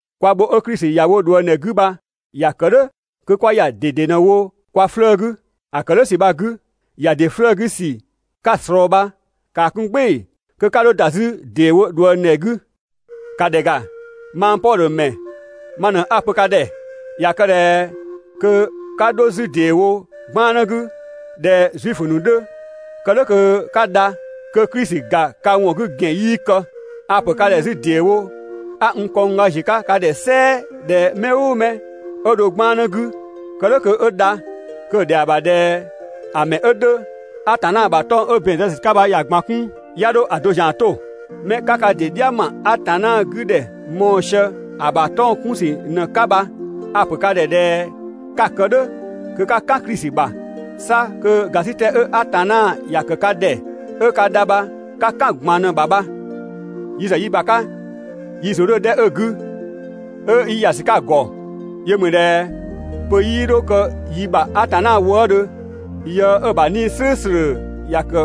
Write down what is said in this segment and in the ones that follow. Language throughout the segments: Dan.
Kwa bho 'ö Klisi ‑ya wo ꞊dhuëngdhɛ 'gü bha ‑ya kë "dhʋ̈ kö 'kwa ‑ya ꞊dede ꞊në‑ wo kwa 'flëë‑ 'gü. ‑A ‑kë "dhʋ̈ ‑sü bha‑ 'gü, ‑ya ‑dɩ 'flëë‑ 'gü ‑sü 'ka‑ ꞊slɔɔ bha ‑kaa 'kun "gbɩɩ‑ kö 'ka 'dho ‑da 'zü ‑deewo ꞊dhuëngdhɛ 'gü. ‑Ka ‑dhɛ ‑ga, mang Pɔdhö ‑mɛ ma ꞊në 'a‑ pö ka ‑dhɛ. ꞊Ya kë ꞊dhɛ kö 'ka 'dho 'zü ‑deewo 'gbannë 'gü (꞊dhɛ Zuifö ‑nu 'dhö kë "dhʋ̈ kö 'ka dha), kö Klisi ‑ga ka ‑wɔn 'gü ‑gɛn 'yii kë. A‑ ‑pö ka ‑dhɛ 'zü ‑deewo 'a n kɔngga ‑ziö 'ka ka ‑dhɛ "sɛɛ ꞊dhɛ mɛ "ʋʋ mɛ 'ö dho 'gbannë 'gü (kë "dhʋ̈ kö 'ö dha), kö‑ ‑dhɛa ‑bha ꞊dhɛ ‑a ‑mɛ 'ö 'dhö, Atanna ‑bha 'tɔng‑ 'ö ‑bɛn zë ‑sü 'ka bha ‑ya ꞊gban 'kun, 'ya 'dho‑ do ‑zian 'to. Mɛ 'ka ka ‑dɩ "dhia ‑ma Atanna 'gü ‑dhɛ mɔɔ‑ sië‑ ‑bha 'tɔng‑ 'kun ‑sü ꞊në‑ 'ka bha, a‑ ‑pö ka ‑dhɛ ꞊dhɛ 'ka‑ kë "dhʋ̈ kö 'ka "kan Klisi ‑bha, 'sa kö ‑gasitɛ 'ö Atanna ‑ya ‑kë ka ‑dhɛ 'ö ka dha bha 'ka "kan‑ ꞊gban ꞊në‑ ‑bha bha. Yi ‑zë yi ‑bha 'ka, yi ‑zʋ 'dhö‑ 'dhɛ 'ö‑ 'gü, 'ö 'yi ‑ya ‑sü 'ka‑ ‑gɔ, yö ‑mü ꞊dhɛ pö 'yii 'dho kë yi ‑bha Atanna wëëdhö yë 'ö‑ ‑bha 'Nii‑ "slʋ̈ʋ̈slʋ̈ ‑ya ‑kë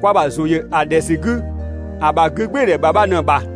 kwa ‑bha ‑zʋ ‑yö ‑a ‑dhɛ ‑sü 'gü, ‑a ‑bha 'gügbɩɩdhɛ ‑bha bha ꞊në‑ ‑bha.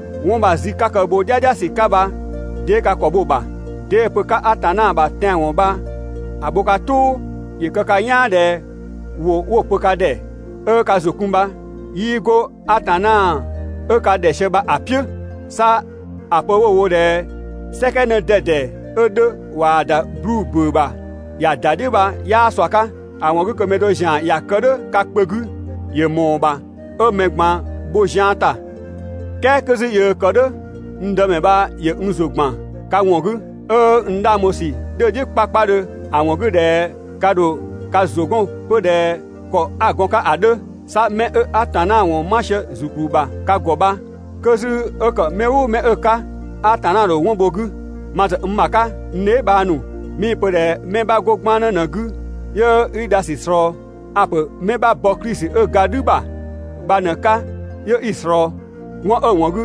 'Wɔn bha‑ zü 'ka kë‑ bho "dhiadhiasü 'ka bha 'dee ka ‑kɔ bho‑ ‑bha? 'Dee‑ pö 'ka Atanna ‑bha tɛanwɔn bha‑ bho ka "tʋʋ? ‑Yö kë ka "yaan ꞊dhɛ ‑wʋ 'wo‑ pö ka ‑dhɛ 'ö ka ‑zʋ kun bha 'yii 'go Atanna 'ö ka ‑dhɛ sië bha‑ "piʋ̈. 'Sa ‑a pö 'wo‑ wo ꞊dhɛ "sɛkɛ 'në 'dɛdɛ 'ö 'dhö ꞊waa‑ ‑da 'bluu‑ ‑bʋ̈ʋ̈ ‑bha ‑ya ‑da "dhiʋ̈ bha 'yaa ꞊sua 'ka. (‑A ‑wɔn 'gü kö mɛ do zian ‑ya kë "dhʋ̈ ka kpö 'gü ‑yö ‑mɔɔ ‑bha 'ö 'mɛ ꞊gban bho zian ‑ta.) "Kɛɛ 'kö 'zü yöö kë "dhʋ̈, n Dëmɛ bha ‑yö n ‑zʋ ‑gban ka ‑wɔn 'gü, 'ö n 'dhang bho ‑sü 'dhö‑ "dhiʋ̈ 'kpakpadhö ‑a ‑wɔn 'gü ꞊dhɛ ka ‑dho ka ‑zʋ 'gɔn 'pö ꞊dhɛ ‑kɔ 'a‑ gɔn‑ 'ka ‑a 'dhö. 'Sa 'mɛ 'ö Atanna ‑wɔn 'ma sië ‑zukplü ‑bha ka ‑gɔ bha, kö 'zü 'ö ‑kë mɛ "ʋʋ mɛ 'ö‑ 'ka, Atanna ‑dho 'wɔn bho‑ 'gü. Ma ‑zë n ‑bha 'ka, n dheebhang ‑nu, 'mii‑ pö ꞊dhɛ 'mɛ 'bha 'go 'gbannë ꞊në‑ 'gü 'yö 'i dha ‑sü ꞊slɔɔ. A‑ ‑pö 'mɛ 'bha bɔ Klisi 'ö ga "dhü ‑bha bha ꞊në‑ 'ka 'yö 'i‑ ꞊slɔɔ. 'Wɔn 'ö‑ ‑wɔn 'gü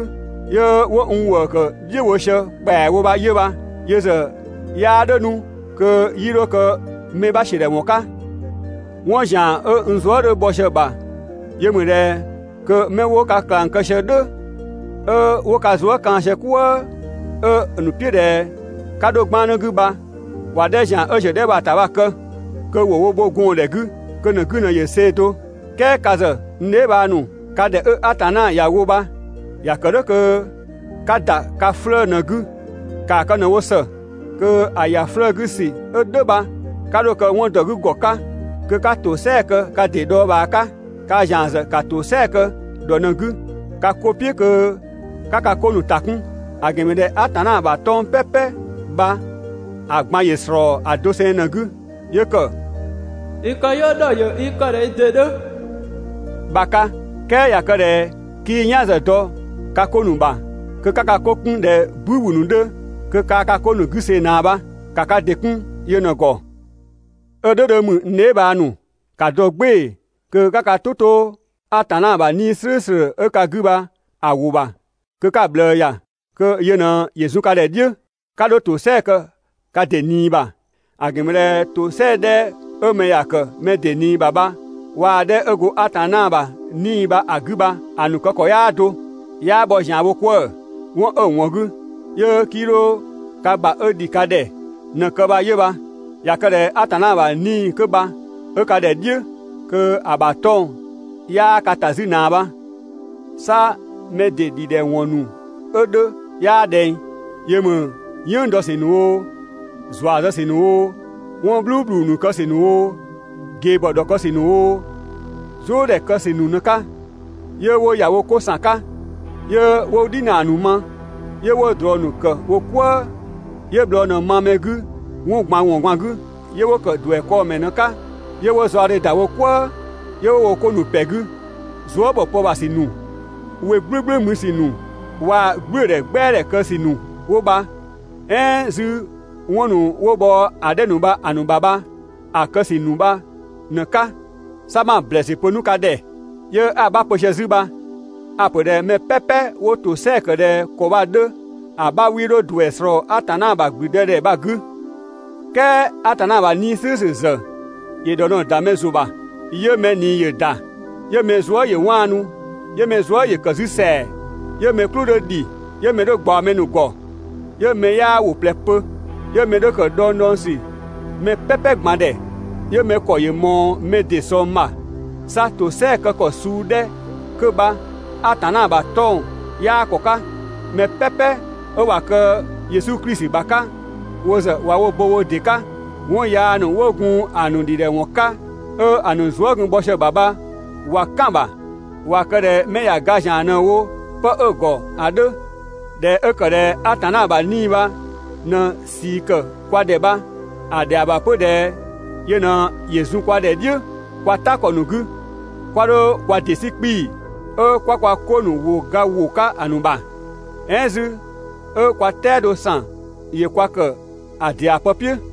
'yö 'wo n ‑wëë ‑kë "dhiʋ̈ bho sië ‑kpɛawo bha 'yö bha. Yö ‑zë 'yaa "dhʋ̈ 'nu kö 'yii 'dho kë mɛ 'bha ‑siödhɛwɔn 'ka. 'Wɔn ‑zian 'ö n zuë" 'dhö bhɔ sië‑ ‑bha yö ‑mü ꞊dhɛ kö 'mɛ 'wo ka ꞊klang kë sië "dhʋ̈, 'ö 'wo ka zuë" kaan‑ sië "kwëë 'ö‑ ‑nu "piʋ̈ ꞊dhɛ 'ka 'dho 'gbannë 'gü bha (‑wa 'dhɛ ‑zian 'ö ‑ziö ‑a 'dhɛ bha‑ ‑ta bha‑ kë), kö ‑wo wo bho gɔɔndhɛ 'gü, kö‑ ‑nu 'gü ꞊në ‑yö see‑ do. "Kɛɛ ka ‑zë, n dheebhang ‑nu, ka ‑dhɛ 'ö Atanna ‑ya wo bha ‑ya ‑kë "dhʋ̈ kö 'ka ‑da ka 'flëë‑ ꞊në‑ 'gü. ‑Kaa kë ꞊në‑ wo ‑së kö ‑a ‑ya ‑dɩ 'flëë‑ 'gü ‑sü 'ö "dhʋ̈ bha 'ka 'dho‑ kë 'wɔn ‑dɔ 'gü ‑gɔ 'ka kö 'ka ‑tosɛa kë ka ‑dɩ dhɔɔbhaa 'ka. Kaa ‑zian ‑zë ‑ka ‑tosɛa kë ‑dhɔ ꞊në‑ 'gü ka 'ko "piʋ̈ kö 'ka ka 'ko ‑nu ‑ta 'kun. ‑A ‑gɛn ‑mü ꞊dhɛ Atanna ‑bha 'tɔng‑ "pɛpɛ bha‑ ꞊gban ‑yö ‑slɔɔ ‑a doseng ꞊në‑ 'gü. 'Yö ‑kë: «I këyɔɔ ‑dhɔ ‑yö i kë ꞊dhɛ i ‑dɩ 'dhö» bha‑ 'ka. "Kɛɛ ꞊ya kë ꞊dhɛ 'kii "yan ‑zë dɔ ka 'ko ‑nu ‑bha, kö 'ka ka 'ko 'kun ꞊dhɛ "bü ‑wü ‑nu 'dhö, kö kaa ka 'ko ‑nu 'gü see‑ ꞊naa bha. ‑Ka ka ‑dɩ 'kun yö ꞊në‑ ‑gɔ. 'Ö "dhʋ̈ 'dhö ‑mü, (n dheebhang ‑nu,) ‑ka dɔ "gbɩɩ‑ kö 'ka ka "tʋ 'to Atanna ‑bha 'Nii‑ "slʋ̈ʋ̈slʋ̈ 'ö ka 'gü bha‑ ‑wʋ ‑bha kö 'ka‑ ꞊bhlëë ‑ya, kö yö ꞊në ‑yö zun ka ‑dhɛ "dhiʋ̈. 'Ka 'dho ‑tosɛa kë ka ‑dɩ ꞊nii ‑bha. ‑A ‑gɛn ‑mü ꞊dhɛ ‑tosɛa 'dhɛ 'ö mɛ ‑ya ‑kë mɛ ‑dɩ ꞊nii ‑bha bha waa‑ 'dhɛ 'ö go Atanna ‑bha 'Nii‑ bha‑ 'gü bha‑ ‑nu kë ‑kɔ 'yaa do, 'yaa bhɔ ‑zianwo 'kwëë‑. 'Wɔn 'ö‑ ‑wɔn 'gü 'yö 'kii 'dho ka ‑bha 'ö ‑dhi ka ‑dhɛ ꞊në‑ kë bha 'yö bha. ꞊Ya kë ꞊dhɛ Atanna ‑bha 'Nii‑ 'kö bha 'ö ka ‑dhɛ "dhiʋ̈, kö‑ ‑bha 'tɔng‑ 'yaa ka ‑ta 'zü ꞊naa bha. 'Sa mɛ ‑dɩ ‑dhidhɛwɔn ‑nu 'ö 'dhö 'yaa ꞊dhɛng. Yö ‑mü "yënng dɔ ‑sü ‑nu oo, ‑zua zë ‑sü ‑nu oo, 'wɔn "bhluubhlu ‑nu kë ‑sü ‑nu oo, ꞊gebhɔ ‑nu ‑dhɔkë ‑sü ‑nu oo, "zʋʋdhɛ kë ‑sü ‑nu ꞊në‑ 'ka, 'yö 'wo ‑ya wo 'ko ‑san 'ka, 'yö 'wo "dhinaa ‑nu ma, 'yö 'wo ꞊drɔ ‑nu ‑kë wo "kwëë, 'yö bhlɔɔ ꞊në ma mɛ 'gü 'wɔn ꞊gban ‑wɔn ꞊gban 'gü, 'yö 'wo ‑kë ‑duɛ 'kɔɔ‑ ‑mɛ ꞊në‑ 'ka, 'yö 'wo zaɔdhe ‑da wo "kwëë, 'yö 'wo wo 'ko ‑nu ‑pɛ 'gü. Zuë" ‑bhɔ pë ‑bha ‑sü ‑nu, we "gblʋ̈gblʋ̈ mü ‑sü ‑nu, waa‑ "gblʋ̈ʋ̈dhɛ "gbɛadhɛ kë ‑sü ‑nu 'wo bha, "ɛɛn 'zü 'wɔn ‑nu 'wo bhɔ ‑a 'dhɛ ‑nu bha‑ ‑nu ‑bha bha‑ kë ‑sü ‑nu bha ꞊në‑ 'ka. 'Sa 'ma‑ ‑blɛɛsü pö 'nu ka ‑dhɛ, 'yö 'a‑ 'bha pö sië 'zü bha: A‑ ‑pö ꞊dhɛ mɛ "pɛpɛ 'wo ‑tosɛa ‑kë ꞊dhɛ ‑kɔ bha‑ 'dhö ‑a 'bha 'wii 'dho ‑duɛ ꞊slɔɔ Atanna ‑bha ‑gblüdëdhɛ bha‑ 'gü. "Kɛɛ Atanna ‑bha 'Nii‑ "slʋ̈ʋ̈slʋ̈ ‑zë ‑yö ‑dhɔ ꞊në‑ ‑da mɛ ‑zʋ ‑bha, 'yö mɛ ꞊nii ‑yö ‑da, 'yö mɛ zuë" ‑yö 'waanu, 'yö mɛ zuë" ‑yö ‑kë 'zü ‑sɛa, 'yö mɛ "klʋ 'dhö ‑dhi, 'yö mɛ 'dhö ꞊gbaɔ mɛ ‑nu ‑gɔ, 'yö mɛ 'yaa ‑wʋ ꞊plɛ pö, 'yö mɛ 'dhö ‑kë dhɔngdhɔngsü mɛ "pɛpɛ ꞊gban ‑dhɛ, 'yö mɛ ‑kɔ ‑yö ꞊mɔɔ mɛ ‑dɩ ꞊sɔng ‑bha. 'Sa ‑tosɛa ‑kë ‑kɔ suu 'dhɛ 'kö bha Atanna ‑bha 'tɔng‑ 'yaa ‑kɔ 'ka. Mɛ "pɛpɛ 'ö ꞊wa kë Yesu Klisi ‑bha 'ka, wo ‑zë ꞊wa wo bo wo ‑dɩ 'ka, 'wɔn yaa ‑nu 'wo gun‑ ‑nu ‑dhidhɛwɔn 'ka, 'ö‑ ‑nu zuë" gun bhɔ sië‑ ‑bha bha ꞊wa "kan‑ ‑bha, ꞊wa kë ꞊dhɛ mɛ ꞊ya ga ‑zian ꞊në‑ wo 'pë 'ö‑ ‑gɔ ‑a 'dhö. ꞊Dhɛ 'ö ‑kë ꞊dhɛ Atanna ‑bha 'Nii‑ bha ꞊në ꞊sii ‑kë kwa ‑dhɛ bha, ‑a ‑dhɛa ‑bha 'pö ꞊dhɛ yö ꞊në ‑yö zun kwa ‑dhɛ "dhiʋ̈ kwa "ta ‑kɔ ‑nu 'gü. 'Kwa 'dho kwa ‑dɩ 'sü 'kpii‑, 'ö 'kwa kwa 'ko ‑nu ‑wʋ ga ‑wo 'ka‑ ‑nu ‑bha, "ɛɛn 'zü 'ö kwa "tɛado ‑san ‑yö kwa ‑kë ‑a ‑dɩa pë "piʋ̈.